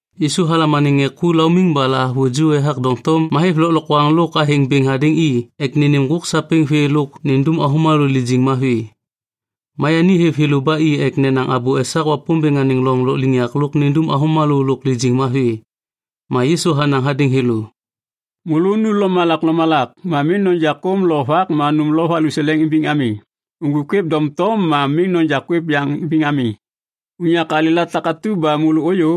Yisu halam anêŋ ŋê ku laumiŋ ba lahavuju ethak doŋtom ma hêv lôklokwaŋ lôk athêŋ bêŋ hadêŋ i ek nênêm ŋgôk sapêŋ vê lôk nindum avômalô lijiŋ mavi. Ma yani hêv thêlô ba i ek nenaŋ abô esak Wapômbêŋ anêŋ loŋ lôkliŋyak lôk nindum avômalô lôk lijiŋ mavi. Ma Yisu hanaŋ hadêŋ thêlô, “Môlô nu lomalak lomalak. Ma miŋ noja kôm lo vak ma nôm lo valuseleŋ imbiŋ ami. Uŋgwik kwêv doŋtom ma miŋ noja kwêv yaŋ imbiŋ ami. Unyak alêla takatu ba môlô ôyô,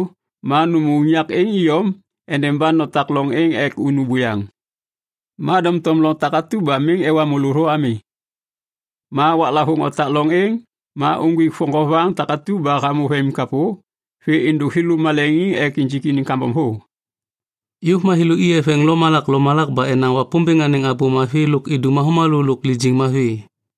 ma nômô unyak êŋ iyom endeba notak loŋ êŋ ek unu buyaŋ. Ma doŋtom loŋ takatu ba miŋ ewa môlô thô ami, ma waklavôŋ otak loŋ êŋ, ma uŋgwik voŋgovaŋ takatu ba hamô vemimkapô vê êndôk thêlô maleŋiŋ ek injik iniŋ kambom thô.” Yôv ma thêlô i eveŋ lomalak lomalak ba enaŋ Wapômbêŋ anêŋ Abô Mavi lôk idum avômalô lôk lijiŋ mavi.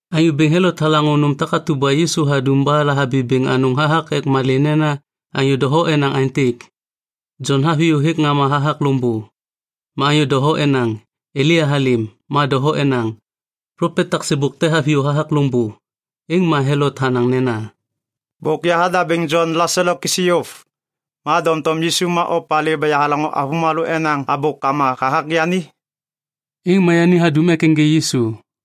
Anyô Bêŋ Helot halaŋô nôm takatu ba Yisu hadum ba lahabi bêŋ anôŋ hathak ek malê nena anyô doho enaŋ aêntêk, “Jon haviyô hêk ŋama hathak loŋbô.” Ma anyô doho enaŋ, “Elia halêm,” ma doho enaŋ, “Plopet tak sêbôk te haviyô hathak loŋbô.” Êŋ ma Helot hanaŋ nena, “Bôk yahadabêŋ Jon laselo kisi yôv, ma doŋtom Yisu ma opalê ba yahalaŋô avômalô enaŋ abôkama hathak yani?” Êŋ ma yani hadum ek ênjê Yisu.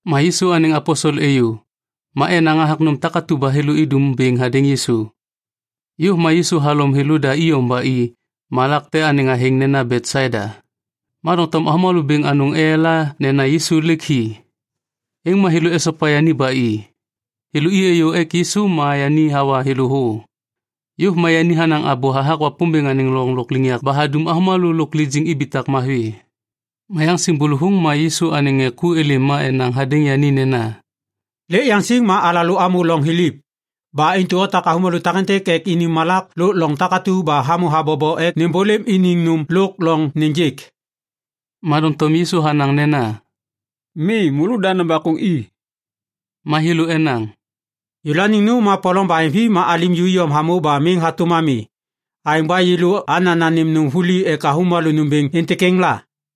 Ma Yisu anêŋ aposel êyô, ma enaŋ hathak nôm takatu ba thêlô idum bêŋ hadêŋ Yisu. Yôv ma Yisu halom thêlôda iyom ba i malak te anêŋ athêŋ nena Betsaida. Ma doŋtom avômalô bêŋ anôŋ eyala nena Yisu lêk hi. Êŋ ma thêlô esopa yani ba i. Thêlô i êyô ek Yisu ma yani hawa thêlô thô. Yôv ma yani hanaŋ abô hathak Wapômbêŋ anêŋ loŋ lôkliŋyak ba hadum avômalô lôk lijiŋ ibitak mavi. Ma yaŋsiŋ bôlôvôŋ ma Yisu anêŋ ŋê ku êlêm ma enaŋ hadêŋ yani nena, “Lêk yaŋsiŋ ma alalô amô loŋ thiliv. Ba intu otak avômalô takêntêk ek ini malak lôk loŋ takatu ba hamô habobo ek nêmbôlêm iniŋ nôm lôk loŋ nêjêk.” Ma doŋtom Yisu hanaŋ nena, “Mi, môlôda nobakôŋ i.” Ma thêlô enaŋ, “Yêlôaniŋ nôm ma polom baheŋvi ma alim ju iyom hamô ba miŋ hatôm ami. Aêŋ ba yêlô ana nanêm nôm vuli ek avômalô nômbêŋ êntêk êŋ la?”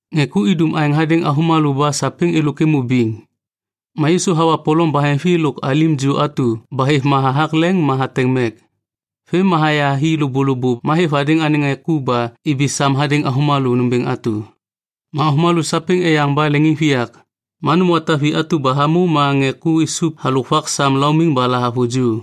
Ŋê ku idum aêŋ hadêŋ avômalô ba sapêŋ êlôk êmô biŋ. Ma Yisu hawa polom baheŋvi lôk alim ju atu ba hêv ma hathak leŋ ma hateŋ mek. Vêm ma haya hi lôbôlôbô ma hêv hadêŋ anêŋ ŋê ku ba ibi sam hadêŋ avômalô nômbêŋ atu. Ma avômalô sapêŋ eyaŋ ba leŋiŋviyak. Ma nôm wata vi atu ba hamô ma ŋê ku isup halôk vak sam laumiŋ ba lahavuju.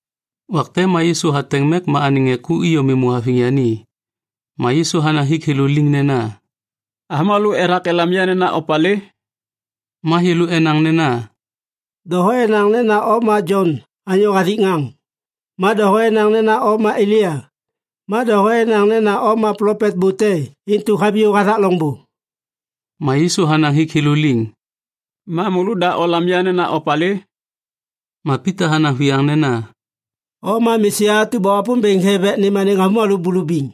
Wak te ma Yisu hateŋ mek ma anêŋ ŋê ku iyom êmô haviŋ yani. Ma Yisu hanaŋ hik thêlô liŋ nena, “Avômalô ethak elam ya nena opalê?” Ma thêlô enaŋ nena, “Doho enaŋ nena o ma Jon anyô hathik ŋaŋ. Ma doho enaŋ nena o ma Elia, ma doho enaŋ nena o ma plopet bô te intu haviyô hathak loŋbô.” Ma Yisu hanaŋ hik thêlô liŋ, “Ma môlôda olam ya nena opalê?” Ma Pita hanaŋ viyaŋ nena, “O ma Mesia atu ba Wapômbêŋ hêv ek nêm anêŋ avômalô bulubiŋ.”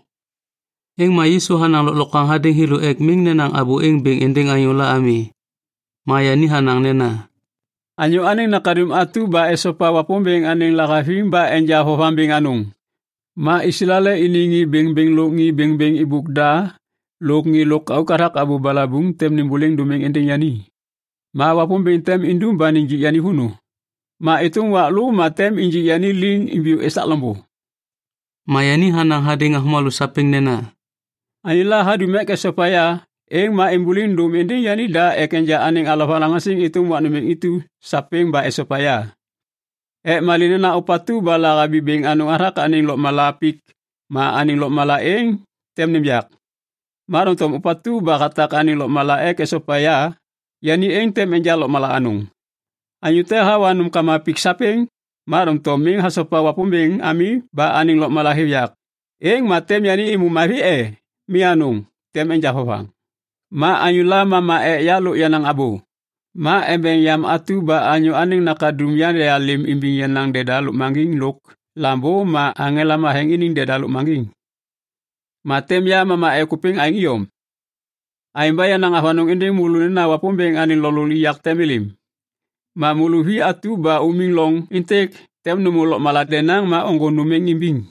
Êŋ ma Yisu hanaŋ lôklokwaŋ hadêŋ thêlô ek miŋ nenaŋ abô êŋ bêŋ êndêŋ anyôla ami. Ma yani hanaŋ nena, “Anyô Anêŋ Nakaduŋ atu tem esopa Wapômbêŋ anêŋ lahaviŋ ba enja vovaŋ bêŋ anôŋ. Ma Islael iniŋ ŋê bêŋbêŋ lôk ŋê bêŋbêŋ êbôk da lôk ŋê lôkauk hathak abô balabuŋ tem nêmbôliŋ dômiŋ êndêŋ yani. Ma Wapômbêŋ tem indum ba nijik yani vônô. Ma êtôm wak lô ma tem injik yani liŋ imbiyô esak loŋbô.” Ma yani hanaŋ hadêŋ avômalô sapêŋ nena, “Anyôla hadum ek esopa ya, êŋ ma êmbôliŋ dôm êndêŋ yanida ma enja anêŋ alovalaŋaŋsiŋ êtôm wak nômbêŋ intu sapêŋ ba esopa ya. Ek malê nena ôpatu ba lahabi bêŋ anôŋ hathak anêŋ lôkmala pik ma anêŋ lôkmala êŋ tem nêm yak. Ma doŋtom ôpatu ba hatak anêŋ lôkmala ek hasopa ya, yani êŋ tem enja lôkmala anôŋ. Anyô te hawa nômkama pik sapêŋ, ma doŋtom miŋ hasopa Wapômbêŋ ami ba anêŋ lôkmala hêv yak, êŋ ma tem yani êmô mavi e? Mi anôŋ, tem enja vovaŋ. Ma anyôla mama ek ya lôk yenaŋ abô, ma embeŋ yam atu ba ya Anyô Anêŋ Nakaduŋ yandealêm imbiŋ yenaŋ deda lôkmaŋgiŋ lôk lambô ma aŋela matheŋ iniŋ deda lôkmaŋgiŋ, ma tem ya mama ek ôpêŋ aêŋ iyom. Aêŋ ba yanaŋ avanôŋ êndêŋ môlô nena Wapômbêŋ anêŋ loŋ lôkliŋyak tem êlêm. Ma môlô vi atu ba umiŋ loŋ êntêk tem nômô lôkmala denaŋ ma ôŋgô nôm êŋ imbiŋ.”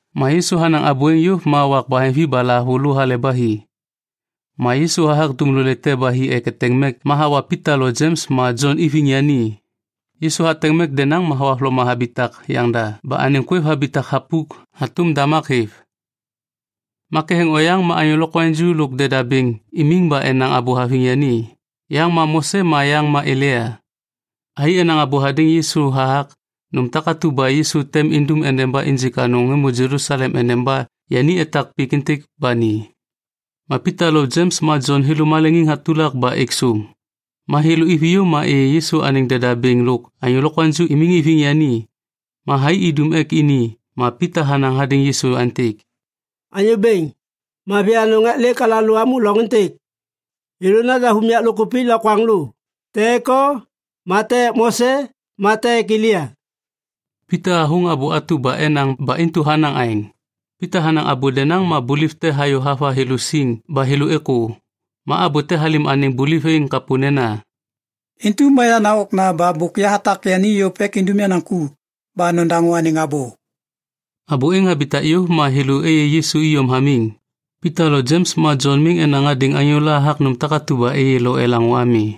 Ma Yisu hanaŋ abô êŋ yôv ma wak baheŋvi ba lahavulô hale ba hi. Ma Yisu hathak dumlolê te ba hi ek eteŋ mek ma hawa Pita lo Jems ma Jon iviŋ yani. Yisu hateŋ mek denaŋ ma thohavloma habitak yaŋda ba anêŋ kwêv habitak thapuk hatôm damak hêv. Ma ketheŋ oyaŋ ma anyô lokwaŋju lôk deda bêŋ imiŋ ba enaŋ abô haviŋ yani, yaŋ ma Mose ma yaŋ ma Elia. Thai enaŋ abô hadêŋ Yisu hathak nôm takatu ba Yisu tem indum ba injik anôŋ êmô Jelusalem endeba yani etak pik êntêk ba ni. Ma Pita lo Jems ma Jon thêlô maleŋ hatulak ba êk sôm. Ma thêlô iviyô ma êyê Yisu anêŋ deda bêŋ lôk anyô ju imiŋ iviŋ yani. Ma thai idum ek ini ma Pita hanaŋ hadêŋ Yisu aêntêk, “Anyô bêŋ, mavi anôŋ ek lêk alalô amô loŋ êntêk. Yêlô nadav unyak lôkkupik lokwaŋlô, te ek o ma te ek Mose ma te ek Elia.” Pita hathôŋ abô atu ba enaŋ ba intu hanaŋ aêŋ. Pita hanaŋ abô denaŋ ma buliv te hayô hava thêlô siŋ ba thêlô êkô. Ma abô te halêm anêŋ buliv êŋ kapô nena, “Intu ma yenaŋ Okna ba bôk yahatak yani yôv ek indum yenaŋ ku. Ba nodaŋô anêŋ abô.” Abô êŋ habitak yôv ma thêlô êyê Yisu iyom hamiŋ. Pita lo Jems ma Jon miŋ enaŋ hadêŋ anyôla hathak nôm takatu ba êyê lo elaŋô ami.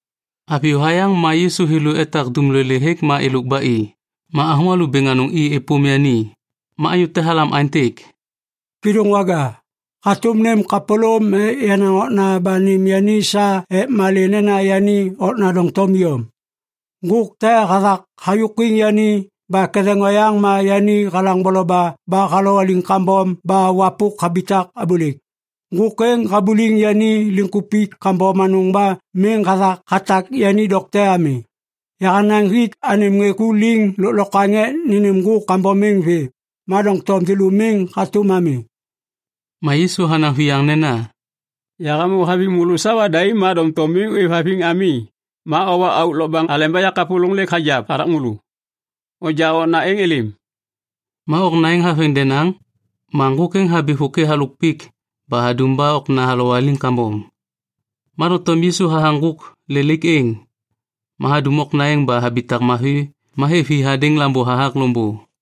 Haviyô hayaŋ ma Yisu thêlô etak dumlolê hêk ma êlôk ba i, ma avômalô bêŋ anôŋ i êpôm yani. Ma anyô te halam aêntêk, “Kêdôŋwaga, hatôm nêm kapôlôm ek yenaŋ okna ba nêm yani sa ek malê nena yenaŋ okna doŋtom iyom. Ŋgôk te hathak hayôkwiŋ yani ba ketheŋ oyaŋ ma yani halaŋ boloba ba halowaliŋ kambom ba wapôk habitak abôlêk. Ŋgôk êŋ habuliŋ yani liŋkupik kambom anôŋ ba miŋ hathak hatak yani dokte ami. Yahanaŋ hik anêm ŋê ku liŋ lôklokwaŋ ek nênêm ŋgôk kambom êŋ vê, ma doŋtom thêlô miŋ hatôm ami.” Ma Yisu hanaŋ viyaŋ nena, “Yahamô haviŋ môlô sawa daim ma doŋtom miŋ ôêvhaviŋ ami ma owa auk lokbaŋ aleba yakapôlôŋ lêk hagiap hathak môlô. Onja okna êŋ êlêm.” Ma okna êŋ haveŋ denaŋ, ma ŋgôk êŋ habi vôkê halôk pik ba hadum ba okna halowaliŋ kambom. Ma doŋtom Yisu hathaŋ ŋgôk lelaik êŋ, ma hadum okna êŋ ba habitak mavi ma hêv hi hadêŋ lambô hathak loŋbô.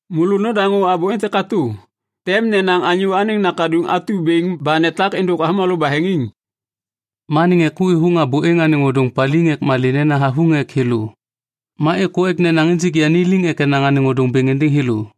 “Môlô nodaŋô abô êntêk katô. Tem nenaŋ Anyô Anêŋ Nakaduŋ atu bêŋ ba netak êndôk avômalô baheŋiŋ.” Ma anêŋ ŋê ku êthôŋ abô êŋ anêŋ ôdôŋ paliŋ ek malê nena havuŋ ek thêlô. Ma êkô ek nenaŋ injik yani liŋ ek enaŋ anêŋ ôdôŋ bêŋ êndêŋ thêlô.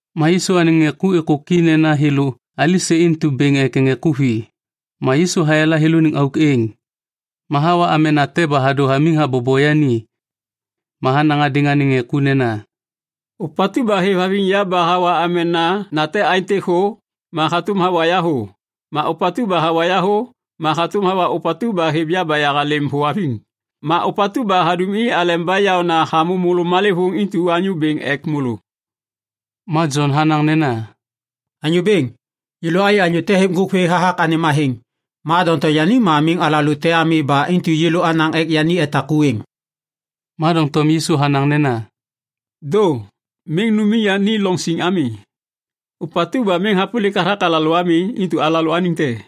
Ma Yisu anêŋ ŋê ku êkôki nena thêlô alisê intu bêŋ ek ŋê ku vi. Ma Yisu hayala thêlôniŋ auk êŋ. Ma hawa amena te ba hadô hamiŋ habobo yani. Ma hanaŋ hadêŋ anêŋ ŋê ku nena, “Ôpatu ba hêvhaviŋ ya ba hawa amena nate aêntêk thô, ma hatôm hawa ya thô. Ma ôpatu ba hawa ya thô, ma hatôm hawa ôpatu ba hêv ya ba yahalêm thô haviŋ. Ma ôpatu ba hadum i aleba yaôna hamô môlô malêvôŋ intu anyô bêŋ ek môlô.” Ma Jon hanaŋ nena, “Anyô Bêŋ, yêlô ayê anyô te hêv ŋgôk vê hathak anêm athêŋ. Ma doŋtom yani ma miŋ alalô te ami ba intu yêlô anaŋ ek yani etak ku êŋ.” Ma doŋtom Yisu hanaŋ nena, “Dô! Miŋ numiŋ yani loŋ siŋ ami. Ôpatu ba miŋ hapôlik hathak alalô ami, intu alalôaniŋ te.”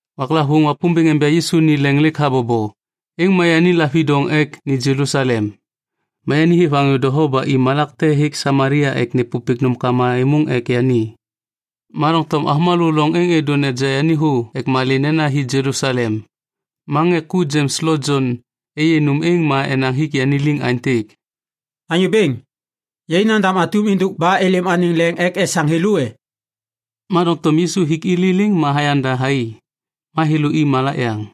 Waklavôŋ Wapômbêŋ enja Yisu ni leŋ lêk habobo, êŋ ma yani lavidoŋ ek ni Jelusalem. Ma yani hêv anyô doho ba i malak te hêk Samalia ek nêpôpêk nômkama êmôŋ ek yani. Ma doŋtom avômalô loŋ êŋ êdô neja yani thô ek malê nena hi Jelusalem. Ma ŋê ku Jems lo Jon êyê nôm êŋ ma enaŋ hik yani liŋ aêntêk, “Anyô Bêŋ, yai nandam atum êndôk ba êlêm anêŋ leŋ ek esaŋ thêlô e?” Ma doŋtom Yisu hik i liliŋ ma hayanda thai. Ma thêlô i malak yaŋ.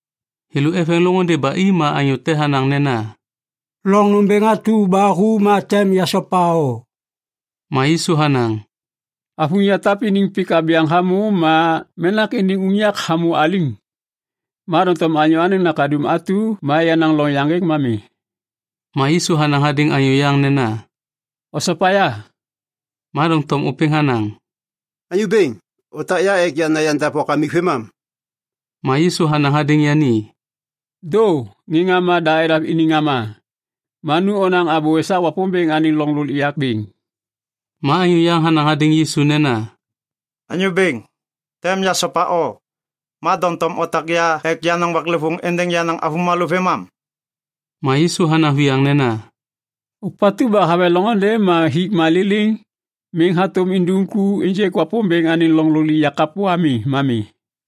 Thêlô eveŋ loŋôndê ba i ma anyô te hanaŋ nena, “Loŋ nômbêŋ atu ba hu ma tem yasopa o.” Ma Yisu hanaŋ, “Avuŋ yatap iniŋ pik abyaŋ hamô ma menak iniŋ unyak hamô aliŋ, ma doŋtom ya Anyô Anêŋ Nakaduŋ atu ma yenaŋ loŋ yaŋgêk ma mi.” Ma Yisu hanaŋ hadêŋ anyô yaŋ nena, “Osopa ya.” Ma doŋtom ôpêŋ hanaŋ, “Anyô Bêŋ, otak ya ek yana yandav wakamik vêmam.” Ma Yisu hanaŋ hadêŋ yani, “Dô, ŋê ŋama da nedav iniŋ ŋama. Ma nu onaŋ abô esak Wapômbêŋ anêŋ loŋ lôkliŋyak bêŋ.” Ma anyô yaŋ hanaŋ hadêŋ Yisu nena, “Anyô Bêŋ, tem yasopa o, ma doŋtom otak ya ek yanaŋ waklêvôŋ êndêŋ yenaŋ avômalô vêmam.” Ma Yisu hanaŋ viyaŋ nena, “Ôpatu ba haveŋ loŋôndê ma hik ma liliŋ miŋ hatôm indum ku ênjêk Wapômbêŋ anêŋ loŋ lôkliŋyak kapô ami ma mi.”